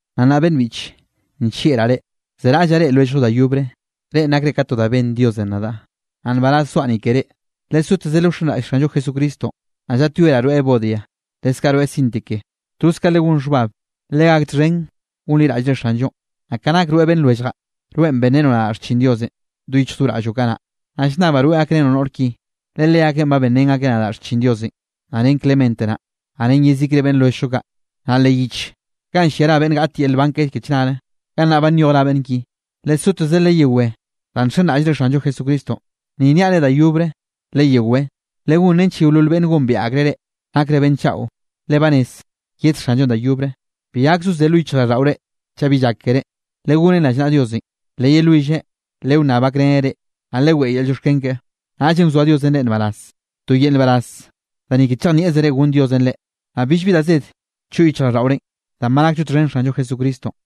Naꞌ nnaꞌ beꞌnn biꞌche, nllieꞌraꞌ reꞌ, zeraꞌllaꞌ reꞌe lwelljllo da yobre. Reꞌn nakre ka to da benn Diosenꞌ nadaꞌ, naꞌ nbaraz zoaꞌ ni ke reꞌ. Lesoteze lewxenraꞌll Xanllo Jesucristonꞌ. Naꞌ llaꞌtyoeraꞌ rweꞌ Evodia, leskaꞌ rweꞌ Síntique, toz ka legón xhbab, legak txhen gonliraꞌllre Xanllonꞌ. Naꞌ ka nak rweꞌ beꞌnn lwelljaꞌ, rweꞌn benrenoꞌ nadaꞌ xchin Diosenꞌ do yichj do raꞌlloꞌ kanaꞌ, naꞌ llnnabaꞌ rweꞌ gakrenoꞌ noꞌr ki, le leakeꞌn ba benrén akeꞌ nadaꞌ xchin Diosenꞌ, naꞌ ren Clemente naꞌ, naꞌ ren yezikre beꞌnn lwelljllo kaꞌ. Naꞌ leꞌ yich ganꞌ llia ra beꞌnn gaꞌt yel nban ke chnare, gannaꞌ ba nyoj ra beꞌnn ki. Lesoteze leyewé danꞌ nxenraꞌllre Xanllo Jesucristonꞌ. Ni nniaꞌ reꞌ da yobre leyewé. Legón nench yeolol beꞌnne gombiaꞌ akreꞌ reꞌ, nakre beꞌnn chaꞌo, le ba rez yed Xanllonꞌ da yobre. Bi gak zozé lo yichjraꞌlldaꞌore chaꞌ bi llak keré, legonen rallnaꞌa Diosenꞌ, leyelwilleꞌ lewnnab gakreneꞌ reꞌ, naꞌ leweꞌe yel llioxken keꞌe. Naꞌllenꞌ wzoa Diosenꞌ reꞌ nbaraz, to yel nbaraz da ni ke chejnieꞌzere gonn Diosenꞌ reꞌ, naꞌ billbi da zed choꞌ yichjraꞌlldaꞌorenꞌ, danꞌ ba nakllo txhen Xanllo Jesucristonꞌ.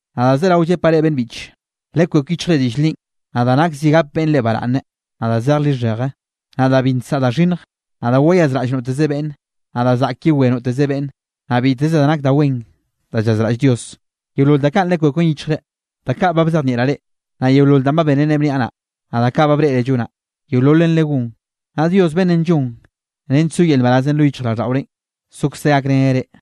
Naꞌ da zerawe llepaꞌ reꞌ beꞌnn biꞌche, lekwek yichjre diꞌll linꞌ, naꞌ da nak zi gap beꞌnn reꞌ baraꞌnne, naꞌ da zeje lixheje, naꞌ da bi nsaꞌa da xhinnj, naꞌ da wayazraꞌll noteze beꞌnne, naꞌ da zaꞌk yewé noteze beꞌnne. Naꞌ biteze da nak da wen da llazraꞌll Dios, yeolol da kaꞌn lekweken yichjre. Da kaꞌ ba bzejnieꞌraꞌ reꞌ, naꞌ yeolol danꞌ ba bénere bniaꞌ naꞌ, naꞌ da kaꞌ ba breꞌre llonaꞌ, yeololen legón. Naꞌ Dios beꞌnnenꞌ llon nench so yel nbarazenꞌ lo yichjraꞌlldaꞌorenꞌ, sokzeꞌ gakreneꞌ reꞌ.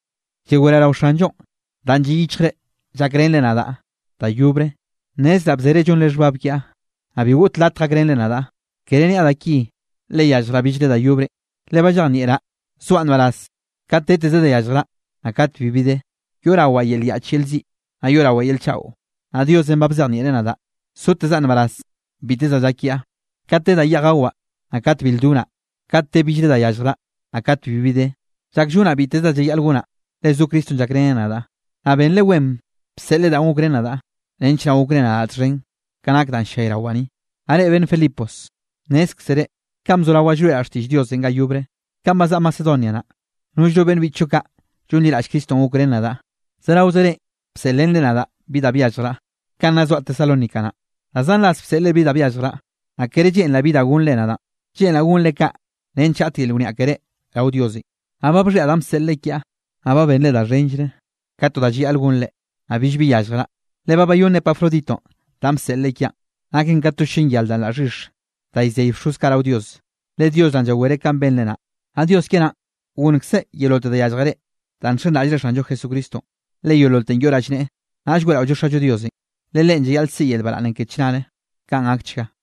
Llaweraꞌ rao Xanllo danꞌ lliꞌ yichjre llakrenre nadaꞌ da yobre. Nnezraꞌ bzere llonre xhbab kiaꞌ, naꞌ bi goꞌt latj gakrenre nadaꞌ. Kere niaꞌ da ki, le yalljraꞌ billre da yobrenꞌ, le ba llejnieꞌraꞌ, zoaꞌ nbaraz kate deteze da yalljraꞌ, naꞌ kate bibi de. Yoꞌrawaꞌ yel yaꞌch yel ziꞌ, naꞌ yoꞌrawaꞌ yel chaꞌo. Naꞌ Diosenꞌ ba bzejnieꞌreꞌ nadaꞌ sotezaꞌ nbaraz biteze da llak kiaꞌ, kate de da yeꞌj gawaꞌ, naꞌ kate bil donaꞌ, kate de billre da yalljraꞌ, naꞌ kat bibi de. Llak llonaꞌ biteze da llayaꞌl gonaꞌ, le zo Cristonꞌ llakreneꞌ nadaꞌ. Naꞌ benre wen bseꞌlre da gokrén nadaꞌ, nench naꞌ gokre nadaꞌ txhen ka nak danꞌ ll-llayrawaꞌ ni. Naꞌ reꞌ beꞌnn Filipos, nnézkzere, kanꞌ bzorawaꞌ llroeꞌraꞌ xtiꞌll Diosenꞌ ga yobre, kanꞌ bazaꞌa Macedonia naꞌ, nollno beꞌnn biꞌchllo kaꞌ llonliraꞌll Cristonꞌ gokrén nadaꞌ, zeraoze reꞌ bseꞌlrenre nadaꞌ bi da byalljraꞌ. Kanꞌ nna zoaꞌ Tesalónica naꞌ, da zan ras bseꞌlre bi da byalljraꞌ. Naꞌ kere lleꞌnraꞌ bi da gonnre nadaꞌn, lleꞌnraꞌ gonre kaꞌ nench gaꞌt yel wniaꞌ keré rao Diosenꞌ. Naꞌ ba bxhiaꞌ danꞌ bseꞌlre kiaꞌ, naꞌ ba benre da xhenllre ka to da llayaꞌl gonre. Naꞌ billbi yalljraꞌ, le ba bayónn Epafroditonꞌ danꞌ bseꞌlre kiaꞌn, naken ka to llen yar da laꞌ xhix da llzey bxoz kaꞌ rao Dios, le Dios naꞌn llawereꞌ kanꞌ benre naꞌ. Naꞌ Dios kiaꞌ naꞌn gonnkzeꞌ yeololte da yallje reꞌ danꞌ nxenraꞌllre Xanllo Jesucristonꞌ, le yeololten yoꞌ rallneꞌe. Naꞌll weꞌraollo Xallo Diosenꞌ, le Leꞌen llayaꞌl siꞌi yel baraꞌnnenꞌ ke chnare. Kaꞌn gakchga.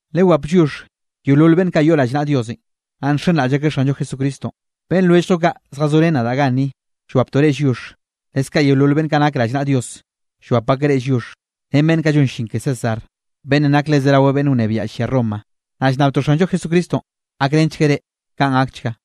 Lewap lliox yeolol beꞌnn kaꞌ yoꞌ rallnaꞌa Diosenꞌ, naꞌ nxenraꞌll akeꞌ Xanllo Jesucristonꞌ. Beꞌnn lwelljllo kaꞌ zjazorén nadaꞌ ganni llwaptoꞌ reꞌ lliox. Leskaꞌ yeolol beꞌnn kaꞌ nak rallnaꞌa Dios llwap akeꞌ reꞌ lliox, ren beꞌnn kaꞌ llon llin ke César, beꞌnnenꞌ nak le zerawe beꞌnn wnebiaꞌ llia Roma. Naꞌ llnnabtoꞌ Xanllo Jesucristonꞌ gakrenchgueꞌ reꞌ. Kaꞌn gakchga.